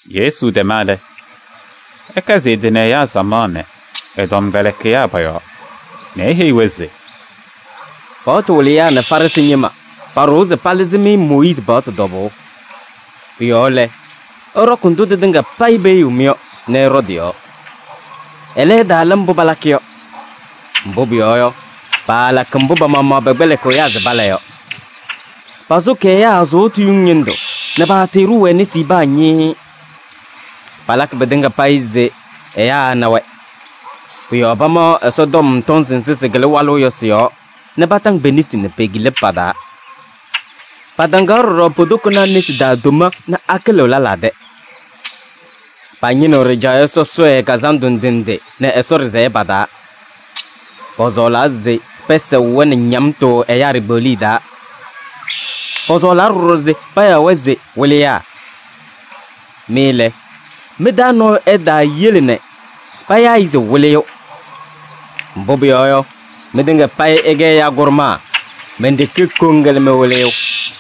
Yesu tɛma lɛ, ɛkɛzɩ ɛ-tɩ nɛ ɛyaa samaɣ nɛ ɛ-tɔmkpɛlɩkɩyaa pɔ-yɔɔ nɛ eheyi-wɛ se: “Paɣtʋ wɩlɩyaa nɛ Farɩsɩ ñɩma paɖʋwa se palɩzɩ-mɩ Mooyiizi paɣtʋ tɔbʋʋ. Pʋ-yɔɔ lɛ, ɩɖɔkɩ ndʋ tɩtɩŋa payɩ peheyiɣ-mɩ yɔ nɛ ɩɖɔ tɩ-yɔɔ. Ɛlɛ, ɩtaala mbʋ palakɩ yɔ. Mbʋ pʋyɔɔ yɔ, paalakɩ mbʋ pa-maɣmaɣ pɛkpɛlɩkɩɣ ɛyaa se pala yɔ. Pasʋkɩ ɛyaa sʋʋtʋ yuŋ ñɩndʋ nɛ paatɩɩɖʋʋ-wɛ nesi paa ñɩɩɩ. Palakɩ pɩtɩŋa payɩ se ɛyaa ɛna-wɛ. Pʋ-yɔɔ pamaɣ Ɛsɔtɔm tɔnzɩ nzɩ sɩkɩlɩ walʋʋ yɔ sɩ-yɔɔ nɛ pataŋ pe-nesi nɛ pe-kila pa-taa. Pataŋaɣ ɖɔɖɔ po-tokonaa nesi taa tomee nɛ akɩlɩɣ lɛlaa tɛ. Pañɩnɩɣ ɖɩjaɣyɛ sɔsɔɖɛ kazandʋ ndɩ ndɩ nɛ Ɛsɔ ɖɩsɛyɛ pa-taa. Pɔsɔɔlaa se pɛsɛɣ-wɛ nɛ ñamtʋ ɛyaa ɖikpeɣliye taa. Pɔsɔɔlaa ɖɔɖɔ se payaɣ-wɛ se: ‘Wɩlɩyaa.’ Mɩ lɛ, mɩ-taa nɔɔyʋ ɛtaayele nɛ payaa-ɩ se: ‘Wɩlɩyʋ.’ Mbʋ pʋyɔɔ yɔ, mɩtɩŋa payɩ ɩkɛ ɛyaa kʋɖʋmaa, men-ɖeke koŋ lɛ mɩ-Wɩlɩyʋ.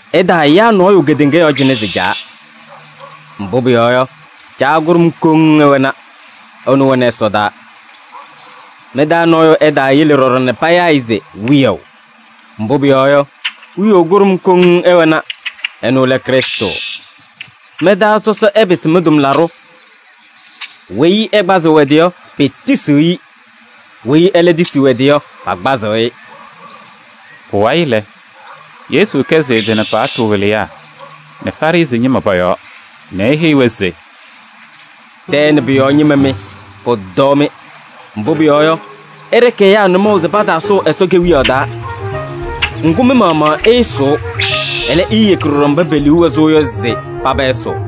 Ɩtaayaa nɔɔyʋ kedeŋa yɔɔ cɩnɛ se: ‘Caa.’ Mbʋ pʋyɔɔ yɔ, Caa kʋɖʋm koŋ ɩwɛna, ɛnʋ wɛnɩ ɛsɔdaa. Mɩ-taa nɔɔyʋ ɛtaayele ɖɔɖɔ nɛ payaa-ɩ se: ‘Wiyaʋ.’ Mbʋ pʋyɔɔ yɔ, Wiyaʋ kʋɖʋm koŋ ɩwɛna, ɛnʋ lɛ Krɩstʋ. Mɩ-taa sɔsɔ ɛpɩsɩ mɩ-tʋmlaɖʋ. Weyi ɛkpazɩɣ ɛ-tɩ yɔ, petisiɣ-i. Weyi ɛlɛ tisiɣ ɛ-tɩ yɔ, pakpazɩ-ɩ.” Pʋwayɩ lɛ, Yesu kɛzɩ ɛ-tɩ nɛ paɣtʋ wɩlɩyaa nɛ Farɩsɩ ñɩma pɔ-yɔɔ nɛ eheyi-wɛ se: “Tɛɛ nɛ pʋ-yɔɔ ñɩma mɩ, pʋtɔɔ-mɩ! Mbʋ pʋyɔɔ yɔ, ɩɖɩkɩ ɛyaa nʋmɔʋ se pataasʋʋ Ɛsɔ Kewiyaɣ taa. Ŋgʋ, mɩ-maɣmaɣ ɩɩsʋʋ, ɛlɛ, iiyeki ɖɔɖɔ mba pe-liu wɛ sʋʋ yɔ se paba ɛsʋʋ. [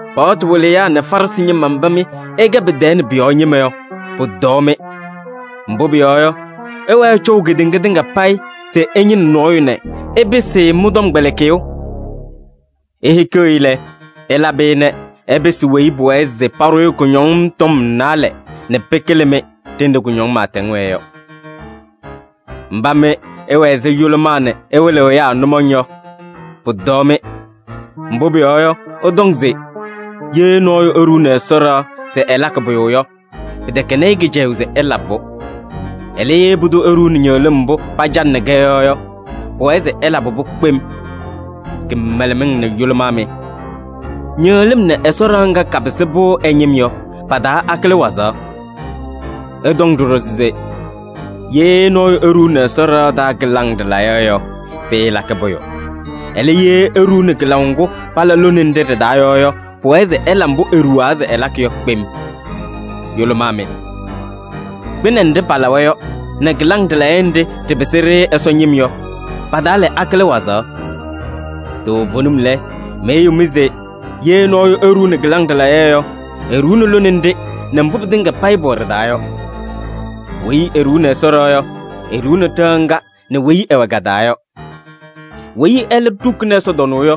“Paɣtʋ wɩlɩyaa nɛ Farɩsɩ ñɩma mba mɩ ɩkɛ tɛɛ pʋ-yɔɔ ñɩma, pʋtɔɔ-mɩ! Mbʋ pʋyɔɔ yɔ, ɩwɛɛ ɩcɔʋ kedeŋa tɩŋa payɩ se ɩñɩnɩ nɔɔyʋ nɛ ɩpɩsɩ-ɩ mɩ-tɔmkpɛlɩkɩyʋ. Ihikiɣ-i lɛ, ɩlabɩ-ɩ nɛ ɛpɩsɩ weyi pʋwɛɛ se paɖʋ-ɩ kʋñɔŋ tɔm naalɛ nɛ pɩkɩlɩ-mɩ, ɖenɖe kʋñɔŋ pɩɩtɛŋ wɛɛ yɔ. “Mba mɩ ɩwɛ ɛzɩ yʋlʋmaa nɛ ɩwɩlɩɣ ɛyaa nʋmɔŋ yɔ, pʋtɔɔ-mɩ! Mbʋ pʋyɔɔ yɔ, ɩtɔŋ se: ‘Ye nɔɔyʋ eɖuuni Ɛsɔ ɖɩɣa se ɛlakɩ pʋyʋ yɔ, pɩtɛkɛnɩ-ɩ kɩcɛyʋʋ se ɛlabɩ-pʋ. Ɛlɛ, ye pʋdʋ eɖuuni ñɩɣlɩm mbʋ pacanɩnɩ-kɛ yɔ yɔ, pʋwɛɛ se ɛlabɩ-pʋ kpem.’ Kɩmɛlɛmɩŋ nɛ yʋlʋmaa mɩ! Ñɩɣlɩm nɛ Ɛsɔ ɖɩɣa ŋga kapɩsɩ-pʋ ɛ-ñɩm yɔ, pa-taa akɩlɩ wazaɣ? Ɩtɔŋ ɖɔɖɔ se: ‘Ye nɔɔyʋ eɖuuni Ɛsɔ ɖɩɣa taa kɩlaŋ ɖɩlayɛ yɔ, pɩɩlakɩ pʋyʋ. Ɛlɛ, ye eɖuuni kɩlaʋ ŋgʋ pala lone nɖɩ ɖɩ-taa yɔ yɔ, pʋwɛɛ se ɛla mbʋ eɖuwaa se ɛlakɩ yɔ kpem.’ Yʋlʋmaa mɩ! Kpɩnɛ nɖɩ palawa yɔ nɛ kɩlaŋ ɖɩlayɛ nɖɩ ɖɩpɩsɩ-ɖɩ Ɛsɔ ñɩm yɔ, pa-taa lɛ, akɩlɩ wazaɣ? Toovenim lɛ, meheyiɣ-mɩ se: ye nɔɔyʋ eɖuuni kɩlaŋ ɖɩlayɛ yɔ, eɖuuni lone nɖɩ nɛ mbʋ pɩtɩŋa payɩ pʋwɛ ɖɩ-taa yɔ. Weyi eɖuuni Ɛsɔ ɖɩɣa yɔ, eɖuuni ɖɩɣa ŋga nɛ weyi ɛwɛ ka-taa yɔ. Weyi ɛlɛ ɖukuni ɛsɔtɔnʋʋ yɔ,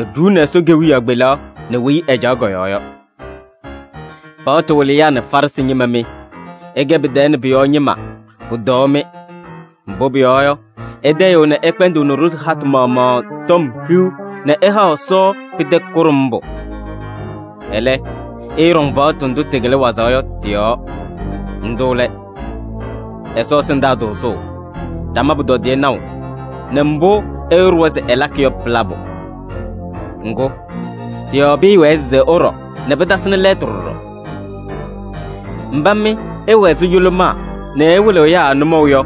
eɖuuni Ɛsɔ Kewiyaɣ kpelaɣ nɛ weyi ɛcaɣ kɔ-yɔɔ yɔ. “Paɣtʋ wɩlɩyaa nɛ Farɩsɩ ñɩma mɩ, ɩkɛ tɛɛ nɛ pʋ-yɔɔ ñɩma, pʋtɔɔ-mɩ! Mbʋ pʋyɔɔ yɔ, ɩtayɩɣ nɛ ɩkpɛndɩɣnɩ ɖozi hatʋ maɣmaɣ tɔm hiu nɛ ɩhaɣ Ɛsɔ pɩtɛ kʋɖʋmbʋ. Ɛlɛ, ɩɩɖɔŋ paɣtʋ ndʋ tɩkɩlɩ wazaɣ yɔ tɩ-yɔɔ. Ndʋ lɛ: Ɛsɔ ɛsɩndaa tʋʋzʋʋ nɛ ɖama pʋtɔdɩyɛ naʋ nɛ mbʋ ɛyʋ ɖʋwa se ɛlakɩ yɔ pɩ-labʋ. Ŋgʋ, tɩ-yɔɔ pɩɩwɛɛ se ɩɖɔ nɛ pɩtasɩnɩ lɛɛtʋ ɖɔɖɔ. Mba mɩ ɩwɛ ɛzɩ yʋlʋmaa nɛ ɩwɩlɩɣ ɛyaa nʋmɔʋ yɔ,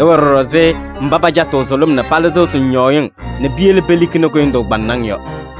ɩwɛ ɖɔɖɔ ɛzɩ mba pacatɩɣ sʋlʋm nɛ palɩzɩɣ sʋŋñɔɔyɩŋ nɛ piyele pelikini kʋyʋndʋʋ kpaŋnaŋ yɔ.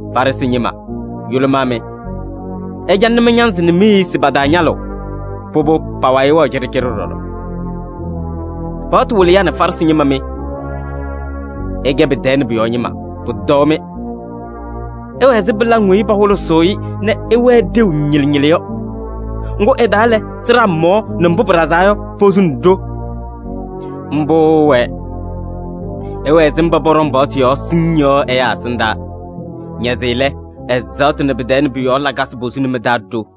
Farɩsɩ ñɩma, yʋlʋmaa mɩ! Ɩcalɩnɩ mɩ-ñanzɩ nɛ mi-eyisi pa-taa ñalʋʋ, pʋbʋ pa-wayɩ wɛɣ cɩɖɩcɩɖɩ ɖɔɖɔ. “Paɣtʋ wɩlɩyaa nɛ Farɩsɩ ñɩma mɩ, ɩkɛ tɛɛ nɛ pʋ-yɔɔ ñɩma, pʋtɔɔ-mɩ! Ɩwɛ ɛzɩ pɩlaŋ weyi pahʋlʋsɩ-ɩ nɛ ɩwɛɛ ɖeu ñɩlɩ ñɩlɩ yɔ. Ŋgʋ ɩ-taa lɛ, sɩɖaa mɔɔ nɛ mbʋ pɩɖazaa yɔ, posuni ɖo. Mbʋ ɩwɛɛ: ɩwɛ ɛzɩ mba pɔɖɔŋ paɣtʋ yɔɔ siŋŋ yɔ ɛyaa ɛsɩndaa. Naze lɛ, ɛzaɣtʋ nɛ tɛɛ nɛ pʋ-yɔɔ lakasɩ posuni mɩ-taa ɖo.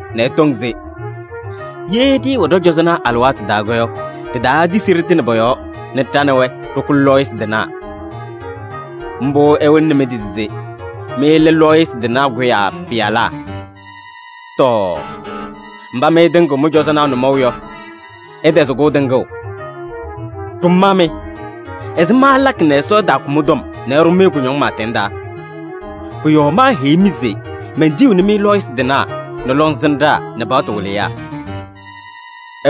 nɛ ɩtɔŋ se: ‘Ye ɖɩɩwɛ ɖɔ-cɔzɔnaa alɩwaatʋ taa yɔ, ɖitaatisi ɖɩtɩnɩ pɔ-yɔɔ nɛ ɖa nɛ wɛ ɖɩkʋ lɔɔyɩsɩ tɩnaa.’ Mbʋ ɩwɩlɩnɩ mɩ-tɩ se mɩ lɛ lɔɔyɩsɩ tɩnaa kʋyaa pɩyalaa. Tɔɔ! Mba mɩ ɩtɩŋɩɣ mɩ-cɔzɔnaa nʋmɔʋ yɔ, ɩtɛzɩ-kʋ tɩŋʋʋ! Ɖʋmaa mɩ! Ɛzɩma ɩlakɩ nɛ Ɛsɔ ɛtaakʋ mɩ-tɔm nɛ ɛɖʋ-mɩ kʋñɔŋ pɩɩtɛŋ taa? Pʋ-yɔɔ meheyiɣ-mɩ se: mentiyiɣni-mɩ lɔɔyɩsɩ tɩnaa nɛ lɔŋsɩnɖaa nɛ paɣtʋ wɩlɩyaa.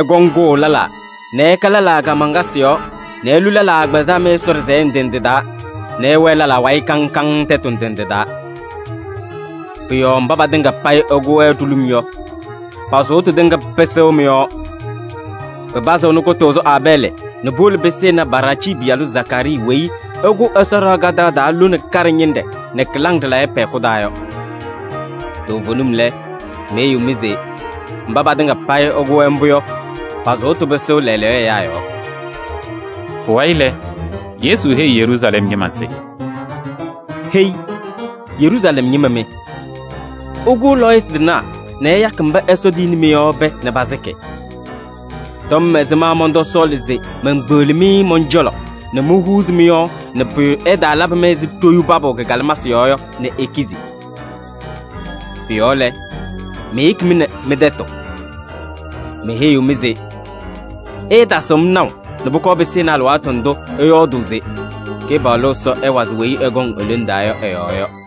Ɩkɔŋ kʋʋ lɛlaa nɛ ɩka lɛlaa kaamaŋkasɩ yɔɔ nɛ ilu lɛlaa agbazɛɛ mɩ-Ɛsɔ ɖɩsɛyɛ ndɩ ndɩ taa nɛ ɩwɛɛ lɛlaa wayɩ kaŋ kaŋ tɛtʋ ndɩ ndɩ taa. Pʋ-yɔɔ mba patɩŋa payɩ ɩkʋ-wɛ ɖulum yɔ, pa-sʋʋtʋ tɩŋa pɩsɩɣ mɩ-yɔɔ. Pɩpazɩɣnɩ kʋtʋʋzʋ Aabɛɛlɩ nɛ puwolo pɩsɩnɩ Baraacii pɩyalʋ Zakaarii weyi ɩkʋ Ɛsɔ ɖɩɣa kadaɣ taa lone kaɖɛ ñɩnɖɛ nɛ kɩlaŋ ɖɩlayɛ pɛ-hɛkʋ taa yɔ. Toovenim lɛ, meheyiɣ-mɩ se: mba patɩŋa payɩ pakʋ-wɛ mbʋ yɔ, pa-sʋʋtʋ pɩsɩɣ lɛɛlɛɛyɔ ɛyaa yɔɔ!” Pʋwayɩ lɛ, Yesu heyi Yeruusalɛm ñɩma se: “Hei! Yeruusalɛm ñɩma mɩ, ɩkʋʋ lɔɔyɩsɩ tɩnaa nɛ ɩyakɩ mba Ɛsɔ tiyini-mɩ yɔ pɛɛ nɛ pasɩkɩ. Tɔm ɛzɩma mɔntɔsɔɔlɩ se menkpeɣli-mɩ mɔn-cɔlɔ nɛ mohuuzi mɩ-yɔɔ nɛ pʋyʋ ɛtaalabɩ-mɩ ɛzɩ ɖoyuu papʋʋ kɩ-kalɩmasɩ yɔɔ yɔ nɛ ikizi? Pʋ-yɔɔ lɛ, meyeki-mɩ nɛ mɩ-tɛtʋ. Meheyiɣ-mɩ se: ɩɩtasɩɣ-m naʋ nɛ pʋkɔɔ pɩsɩnɩ alɩwaatʋ ndʋ ɩyɔɔdʋʋ se: ‘Kɩpaɣlʋ Ɛsɔ ɛwazɩ weyi ɛkɔŋ e-lone taa yɔ ɛ-yɔɔ’ yɔ.”